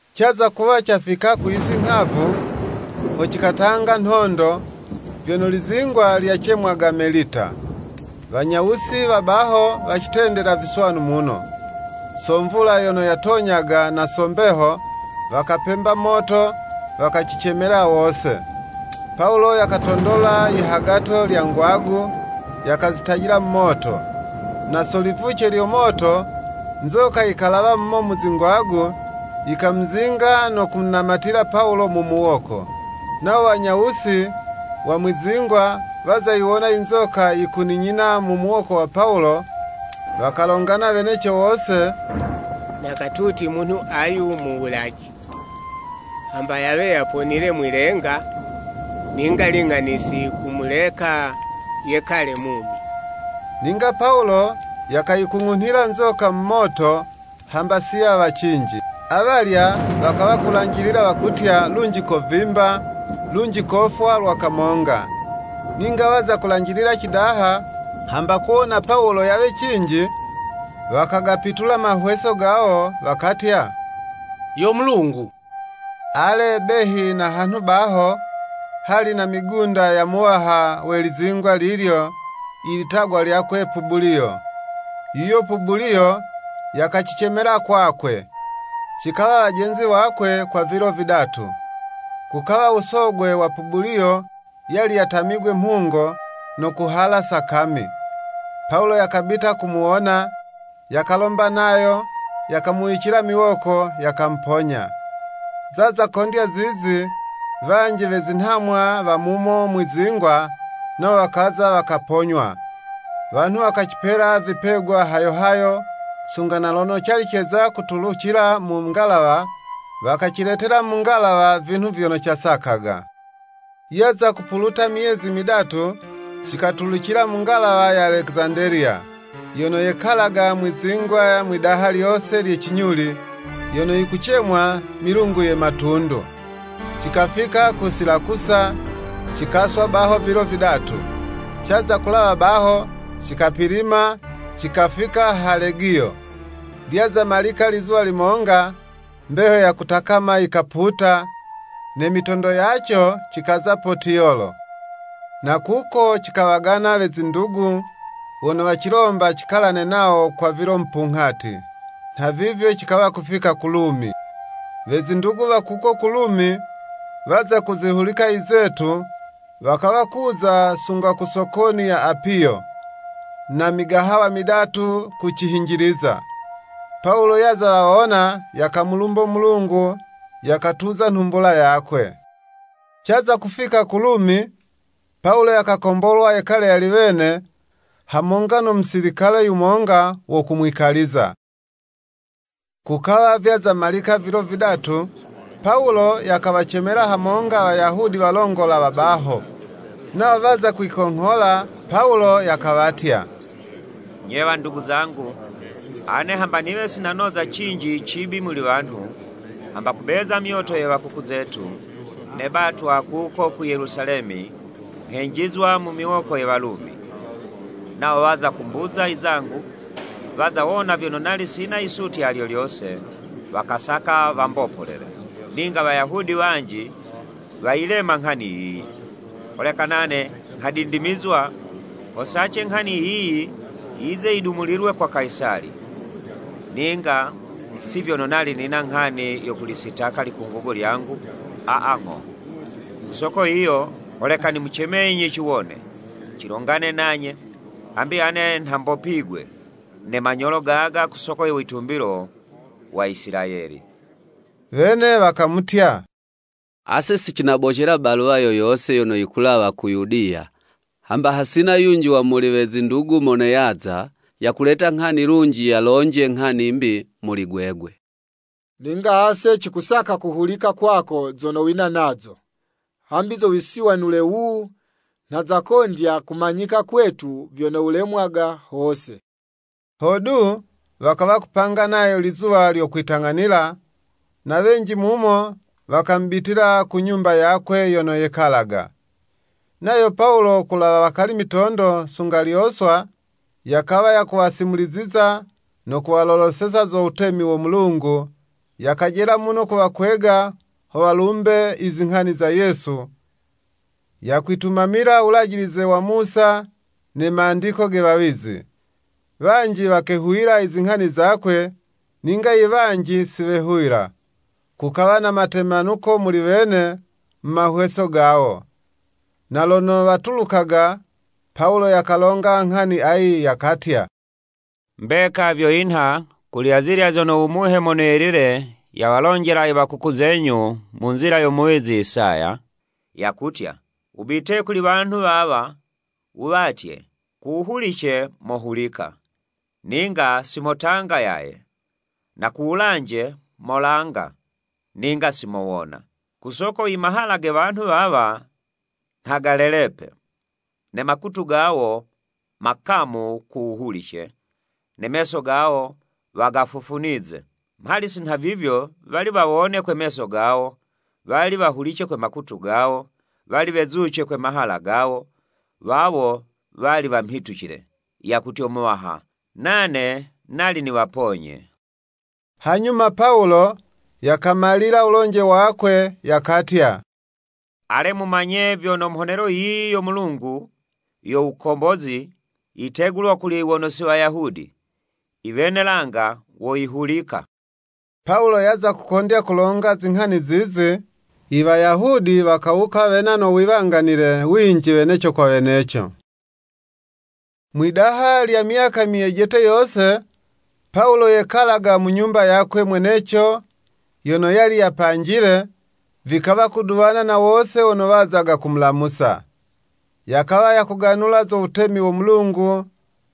Caza kuwa cafika ku yisi nghavu, ho cikatanga nhondo, vyono lizingwa lyacemwaga Melita. Wanyawusi wa baho, wacitendela viswanu muno. So mvula yono yatonyaga na so mbeho, wakapemba moto, wakacicemela wose. Pawulo yakatondola yihagato lya ngwagu, yakazitajila mu moto, na so livuce lyo moto, nzoka yikalawa mumo mu zingwagu, yikamuzinga no kumunamatila Pawulo mu muwoko. Nawo wanyawusi wa mwi'zingwa, waza yiwona i nzoka yikuninyina mu muwoko wa Pawulo, wakalongana weneco wose, “Na katuti munhu ayu muwulaji, hamba yawe yaponile mwi'lenga, ninga ling'ani si yikumuleka yekale mumi.” Ninga Pawulo yakayikung'unhila nzoka mu moto, hamba si yawa cinji. Awalya wakawa kulanjilila wakutya lunji kovimba, lunji kofwa lwa kamonga. Ninga waza kulanjilila cidaha, hamba kuwona Pawulo yawe cinji, wakagapitula mahweso gawo, wakatya, yo mulungu. Ale, behi na hanhu baho, hali na migunda yo muwaha we lizingwa lilyo, ilitagwa lyakwe Pubuliyo. Yuyo Pubuliyo yakacicemela kwakwe, cikawa wajenzi wakwe kwa vilo vidatu. Kukawa u Sogwe wa Pubuliyo yali yatamigwe mhungo, no kuhala sakami. Pawulo yakabita kumuwona, yakalomba nayo, yakamuwicila miwoko, yakamuponya. Zaza kondya zizi, wanji we zinhamwa wa mumo mwi'zingwa, nawo wakaza wakaponywa. Wanhu wakacipela vipegwa hayo hayo, sunga na lono cali ceza kutulucila mu ngalawa wakaciletela mu ngalawa vinhu vyono casakaga. Yaza kupuluta myezi midatu, cikatulucila mu ngalawa ya Alekizandeliya, yono yekalaga mwi'zingwa mwidaha lyose lye cinyuli, yono yikucemwa “Milungu ye Matundu.” Cikafika ku Silakusa, cikaswa baho vilo vidatu. Caza kulawa baho, cikapilima, cikafika ha Legiyo. Lyaza malika lizuwa limonga, mbeho ya kutakama yikaputa, ne mitondo yaco cikaza Potiyolo. Na kuko cikawagana we zindugu, wono wacilomba cikalane nawo kwa vilo mupunghati. Nhavivyo cikawa kufika ku Lumi. We zindugu wa kuko ku Lumi, waza kuzihulika izetu, wakawa kuza sunga ku Sokoni ya Apiyo, na Migahawa midatu kucihinjiliza. Pawulo yaza wawona yakamulumbo Mulungu, yakatuza nhumbula yakwe. Caza kufika ku Lumi, Pawulo yakakombolwa yekale yali wene, hamonga no musilikale yumonga wo kumwikaliza. Kukawa vyaza malika vilo vidatu, Pawulo yakawacemela hamonga Wayahudi walongola wa baho. Nawo waza kwikonghola, Pawulo yakawatya “Nye wandugu zangu, ane hamba niwe si nanoza cinji cibi muli wanhu, hamba kubeza myoto ye wakuku zetu, nebatwa kuko ku Yelusalemi nghenjizwa mu miwoko ye Walumi. Nawo waza kumbuza izangu, waza wona vyono nali sina yisutya lyo lyose, wakasaka wambopolele. “Ninga Wayahudi wanji wayilema nghani yiyi, holeka nane nghadindimizwa ho sace nghani yiyi yize yidumulilwe kwa Kayisali. Ninga si vyono nali nina nghani yo kulisitaka likungugo lyangu, aa, ng'o. Ku soko yiyo holeka nimucemenyi ciwone, cilongane nanye, hambi ane nha mbopigwe ne manyolo gaga ku soko yo witumbilo wa Isilayeli.” Wene wakamutya, “Ase si cinabocela baluwa yo yose yono yikulawa ku Yudiya, hamba hasina yunji wa muli we zindugu mono yaza, yakuleta nghani lunji yalonje nghani 'mbi muli gwegwe. Ninga ase cikusaka kuhulika kwako zono wina nazo, hambi zo wisiwanule wuwu, nha zakondya kumanyika kwetu vyono wulemwaga hose.” Hodu, wakawa kupanga nayo lizuwa lyo kwitang'anila, na wenji muno wakamubitila ku nyumba yakwe yono yekalaga. Nayo Pawulo ku wulawa hakali mitondo sunga lyoswa, yakawa yakuwasimuliziza no kuwaloloseza zo Wutemi wo Mulungu, yakajela muno kuwakwega ho walumbe izinghani za Yesu, yakwitumamila Wulajilize wa Musa ne mandiko ge wawizi. Wanji wakehuwila izinghani zakwe, ninga iwanji si wehuwila. Kukawa na matemanuko muli wene mu mahweso gawo. Na lono watulukaga, Pawulo yakalonga nghani ayi, yakatya “Mbeka vyo yinha kuli azilya zono u Muhe Mono Yelile yawalonjela i wa kuku zenyu mu nzila yo muwizi Isaya, yakutya; ‘Wubite kuli wanhu wawa, wuwatye, ku wuhulice mohulika, ninga si motanga yaye, na ku wulanje molanga, ninga si mowona. Ku soko imahala ge wanhu wawa nha galelepe, ne makutu gawo, makamu ku wuhulice, ne meso gawo wagafufunize. Mhali si nhavivyo, wali wawone kwe meso gawo, wali wahulice kwe makutu gawo, wali wezuce kwe mahala gawo, wawo wali wamhitucile, yakutyo Muwaha, nane nali niwaponye.’” Hanyuma Pawulo yakamalila wulonje wakwe yakatya, “Ale, mumanye vyono mhonelo yiyi yo Mulungu yo wukombozi, yitegulwa kuli wono si Wayahudi, iwene langa woyihulika!” [ Pawulo yaza kukondya kulonga zinghani zizi, Iwayahudi wakawuka wena no wiwanganile winji weneco kwa weneco.] Mwidaha lya myaka myejete yose, Pawulo yekalaga mu nyumba yakwe mweneco yono yali yapanjile, vikawa kuduwana na wose wono wazaga kumulamusa. Yakawa yakuganula zo wutemi wo Mulungu,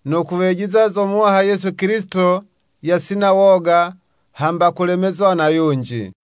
no kuwejiza zo Muwaha Yesu Kilisito yasina woga, hamba kulemezwa na yunji.